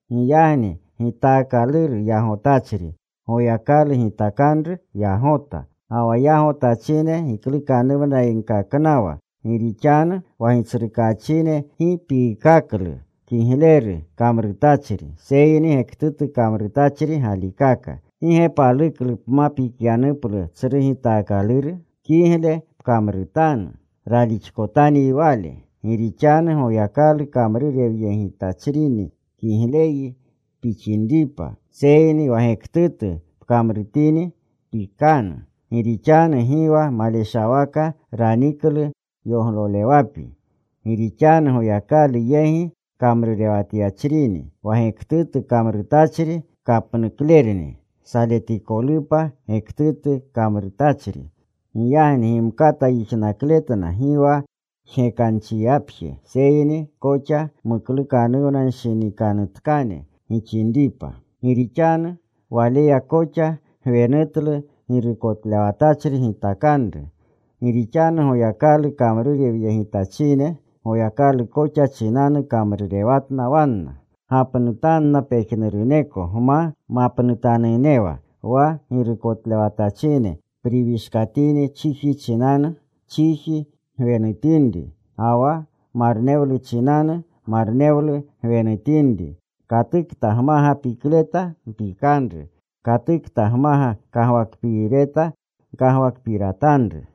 Giyagni gitaakaluru yagotachri, Goyakalu gitakanru yagota. Ga wa yagotachine giklukanuwnayegkaknawa. Gi rixanu wa gitsrukaachine gi piikaklu kigleru kamrutachri, seyni gektutu kamrutachri galikaka. ¿Gi ge paluklu pma pikyanuplu tsru gitaakaluru? Kigleru pkamrutanu. Ralixkotanyi wale. Gi rixanu Goyakalu kamrurewyegitachrini kigleyyi pixinripa, seyni wa gektutu pkamrutini, pikanu. Gi rixanu gi wa maleshawaka raniklu yoglolewapi. Gi rixanu Goyakalu yegi kamrurewatyachrini. Wa gektutu kamrutachri kapnuklerni, saletikolupa gektutu kamrutachri. Giyagni gimkata yijnakletna gi wa jgekanchiyapje, seyni koxa muklukanuwnanshinikanutkane gixinripa. Gi rixanu waleya koxa gwenutlu girukotlewatachri gitakanru. Gi rixanu Goyakalu kamrurewyegitachine. Goyakalu koxa chinanu kamrurewatna wanna. Gapnutanna pejnuruneko gma mapnutanunnewa. Wa girukotlewatachine priwishkatini chiji chinanu, chiji gwenutinri, ga wa marnewlu chinanu, marnewlu gwenutinri. Katukta gmaga pikleta mpikanru. Katukta gmaga kagwakpiireta, gkagwakpiratanru.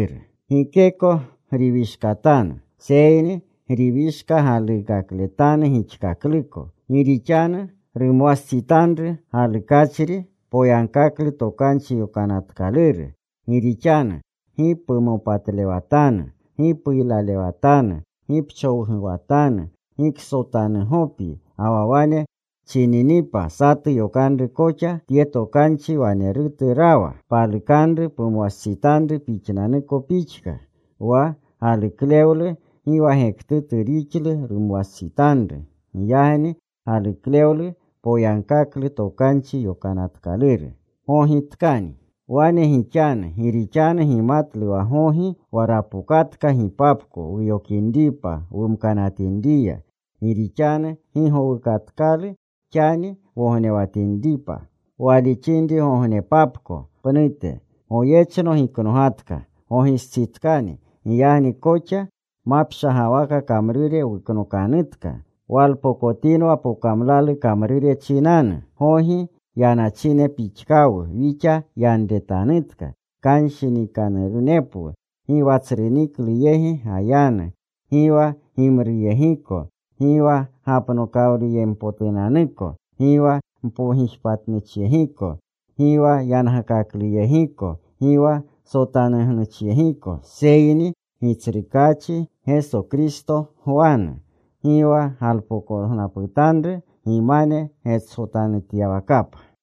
Gikeko griwishkatanu, seyni griwishka galuukakletanu gixkakluko. Gi rixanu rumwastsitanru galukachri poyagkaklu Tokanchi Yokanatkaluru. Gi rixanu: Gi pumopatlewatanu, gi puylalewatanu, gi pchowguwatanu, gi ksotanugopyi, ga wa wane chininipa satu yokanru koxa, tye tokanchi wanerutu rawa: Palukanru pumwastsitanru pixnanuko pixka. Wa galuklewlu gi wa gektutu rixlu rumwastsitanru. Giyagni galuklewlu poyagkaklu Tokanchi Yokanatkaluru. Wane gixanu gi rixanu gimatlu wa gogi, wa rapokatka gipapko wuyokinripa wumkinriya. Gi rixanu gi gowukatkalu xani wognewatinripa, walixinrigognepapko pnute. Goyechno giknogatka. Gogistsitkani. Giyagni koxa mapshagawaka kamrure wuknokanutka. Walpokotinwa pokamlalu kamrure chinanu. Gogi yanachine pixkawu wixa yanretanutka; kshinikanurunepwu; gi wa tsru niklu yegi gayanu, gi wa gimruyegiko, gi wa gapoklewluyempotunanuko, gi wa mpogijpatnuchyegiko, gi wa yangakakluyegiko, gi wa sotanugnuchiyegiko. Seyni Gitsrukaachi Geso Kristo gwanu. Gi wa galpokognaputanru gimane getsotanutyawakapa.